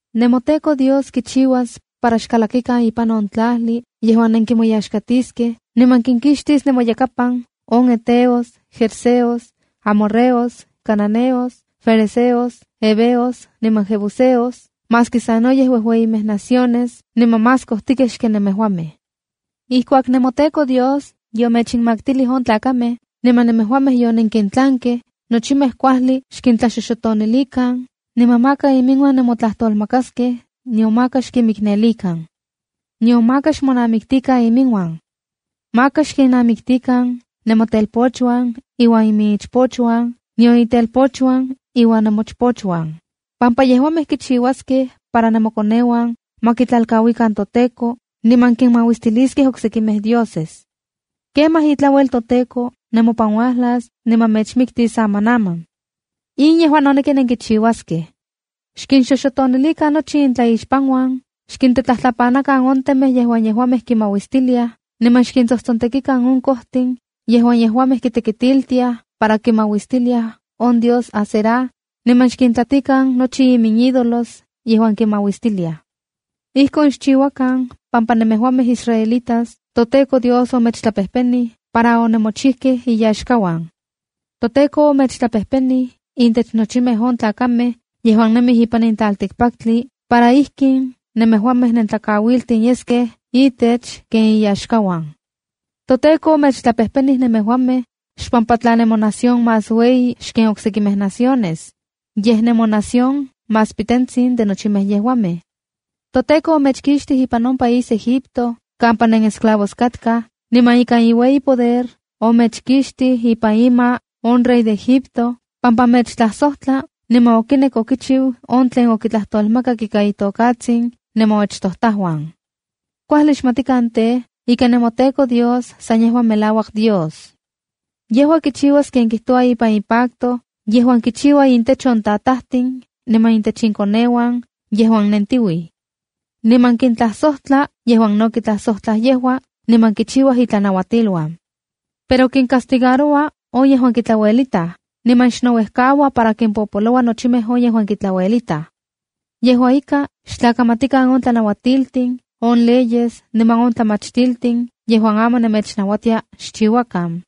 ’NemoTEKO Dios kichiuas para xkalakikan ipan on tlajli yejuan nenkimoyaxkatiskej, niman kinkixtis nemoyakapan on heteos, gergeseos, amorreos, cananeos, ferezeos, heveos niman jebuseos, maski sanoyej ueueyimej naciones niman más kojtikej xken nemejuamej. Ijkuak nemoTEKO Dios yomechinmaktilij on tlakamej, niman nemejuamej yonenkintlankej, nochimej kuajli xkintlaxoxotonilikan, niman maka iminuan nemotlajtolmakaskej, nion maka xkinmiknelikan. Nion maka xmonamiktikan iminuan. Maka xkinnamiktikan nemotelpochuan iuan iminichpochuan, nion intelpochuan iuan nemochpochuan, pampa yejuamej kichiuaskej para nemokoneuan ma kitlalkauikan toTEKO, niman kinmauistiliskej oksekimej dioses. Kemaj itlauel toTEKO nemopan uajlas niman mechmiktis amanaman. ’In yejua noneki nenkichiuaskej: Xkinxoxotonilikan nochi intlaixpanuan, xkintetlajtlapanakan on temej yejuan yejuamej kinmauistiliaj, niman xkintsojtsontekilikan on kojtin yejuan yejuamej kitekitiltiaj para kimauistiliaj on dios Asera niman xkintlatikan nochi iminídolos yejuan kinmauistiliaj. Ijkon xchiuakan pampa nemejuamej israelitas toTEKO Dios omechtlapejpenij para onemochijkej iyaxkauan. ToTEKO omechtlapejpenij intech nochimej on tlakamej yejuan nemij ipan in tlaltikpaktli, para ijkin nemejuamej nentlakauiltin yeskej itech ken iyaxkauan. ’ToTEKO omechtlapejpenij nemejuamej xpampa tla nemonación más ueyi xken on oksekimej naciones, yej nemonación más pitentsin de nochimej yejuamej. ToTEKO omechkixtij ipan on país Egipto kampa nenesclavos katkaj, niman ikan iueyi poder omechkixtij ipan ima on rey de Egipto, pampa mechtlajsojtla niman okinek okichiu on tlen okintlajtolmakak ika itokatsin nemoachtojtajuan. ’Kuajli xmatikan tej, ika nemoTEKO Dios san yejua melauak Dios. Yejua kichiuas ken kijtoua ipan ipacto, yejuan kichiua intech on tatajtin niman intech inkoneuan yejuan nentiuij. Niman kintlajsojtla yejuan no kitlajsojtlaj yejua, niman kichiuaj itlanauatiluan. Pero kincastigaroua on yejuan kitlauelitaj, niman xnouejkaua para kimpopoloua nochimej on yejuan kitlauelitaj. Yejua ika, xtlakamatikan on tlanauatiltin, on leyes, niman on tlamachtiltin yejuan aman nemechnauatia xchiuakan.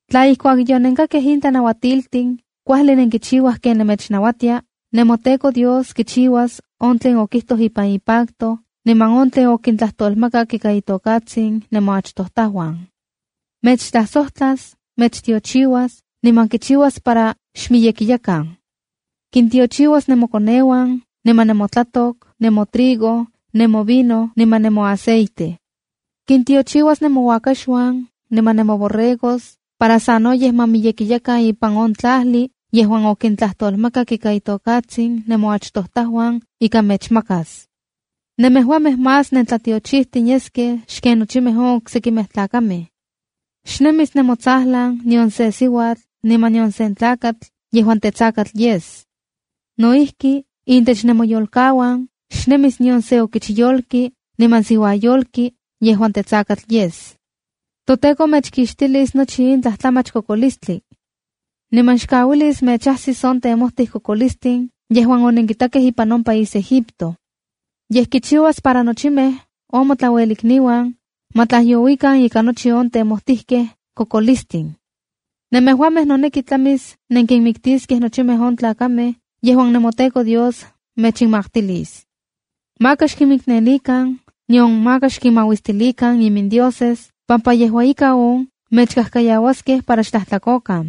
’Tla ijkuak yonenkakkej in tlanauatiltin, kuajli nenkichiuaj ken mechnauatia, nemoTEKO Dios kichiuas on tlen okijtoj ipan ipacto, niman on tlen okintlajtolmakak ika itokatsin nemoachtojtajuan. Mechtlajsojtlas, mechtiochiuas, niman kichiuas para xmiyekiyakan. Kintiochiuas nemokoneuan niman nemotlatok, nemotrigo, nemovino niman nemoaceite. Kintiochiuas nemouakaxuan niman nemoborregos para sanoyej ma miyekiyakan ipan on tlajli, yejuan okintlajtolmakak ika itokatsin nemoachtojtajuan ika mechmakas. Nemejuamej más nentlatiochijtin yeskej xken nochimej on oksekimej tlakamej. Xnemis nemotsajlan nion sen siuatl niman nion sen tlakatl yejuan tetsakatl yes. No ijki, intech nemoyolkauan, xnemis nion se okichyolki niman siuayolki yejuan tetsakatl yes. ToTEKO mechkixtilis nochi tlajtlamach kokolistli. Niman xkauilis mechajsis on temojtikejj kokolistin yejuan onenkitakej ipan on país Egipto. Yej kichiuas para nochimej on motlauelikniuan ma tlajyouikan ika nochi on temojtijkej kokolistin. Nemejuamej noneki tlamis nenkinmiktiskej nochimej on tlakamej yejuan nemoTEKO Dios mechinmaktilis. Maka xkinmiknelikan nion maka xkinmauistilikan imindioses, pampa yejua ika on mechkajkayauaskej para xtlajtlakokan.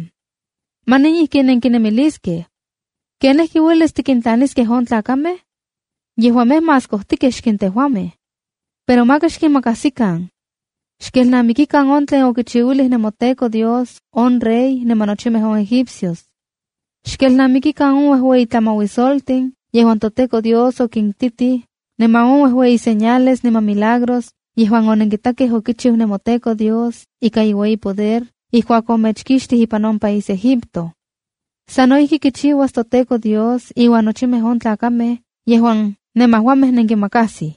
’Manin ijkin nenkinemiliskej: “¿Kenijki uelis tikintlaniskej on tlakamej? Yejuamej más miyekej xken tejuamej.” Pero maka xkinmakajsikan. Xkelnamikikan on tlen okichiuilij nemoTEKO Dios on rey niman nochimej on egipcios. Xkelnamikikan on uejueyi tlamauisoltin yejuan toTEKO Dios okintitij, niman on uejueyi señales niman milagros yejuan onenkitakej okichiu nemoTEKO Dios ika iueyi poder ijkuak omechkixtij ipan on país Egipto. Sa no ijki kichiuas toTEKO Dios iuan nochimej on tlakamej yejuan nemejuamej nenkinmakasij.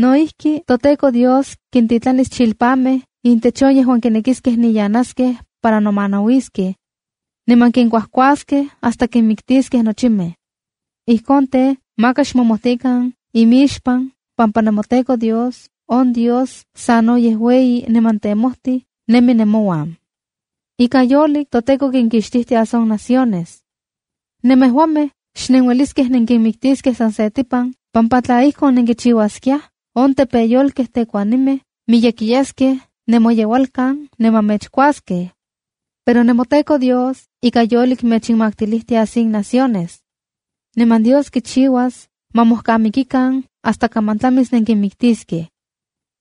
No ijki, toTEKO Dios kintitlanis chilpamej intech on yejuan kinekiskej niyanaskej para nomanauiskej, niman kinkuajkuaskej hasta kinmiktiskej nochimej. ’Ijkon tej, maka xmomojtikan imixpan pampa nemoTEKO Dios, on Dios sanoyej ueyi niman temojtij, nemi nemouan. Ika yolik toTEKO kinkixtijtias on naciones. Nemejuamej xnenueliskej nenkinmiktiskej san setipan, pampa tla ijkon, nenkichiuaskiaj on tepeyolkej tekuanimej miyekiyaskej nemoyeualkan niman mechkuaskej. Pero nemoTEKO Dios ika yolik mechinmaktilijtias in naciones. Niman Dios kichiuas ma mojkamikikan hasta kaman tlamis nenkinmiktiskej.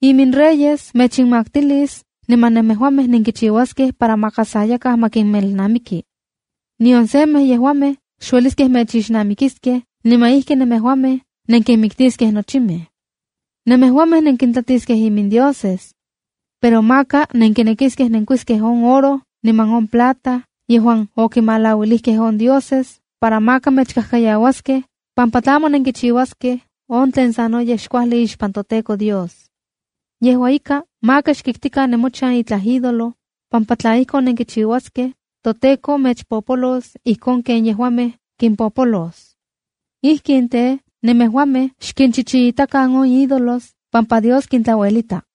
Iminreyes mechinmaktilis niman nemejuamej nenkichiuaskej para maka sa yakaj ma kinmelnamiki. Nion semej yejuamej xueliskej mechixnamikiskej niman ijki nemejuamej nenkinmiktiskej nochimej. ’Nemejuamej nenkintlatiskej imindioses. Pero maka nenkinekiskej nenkuiskej on oro niman on plata yejuan okimalauilijkej on dioses, para maka mechkajkayauaskej, pampa tlamo nenkichiuaskej on tlen sanoyej xkuajli ixpan toTEKO Dios. Yejua ika, maka xkiktikan nemochan itlaj ídolo, pampa tla ijkon nenkichiuaskej, toTEKO mechpopolos ijkon ken yejuamej kimpopolos. Ijkin tej, nemejuamej xkinchichiitakan on ídolos pampa Dios kintlauelita.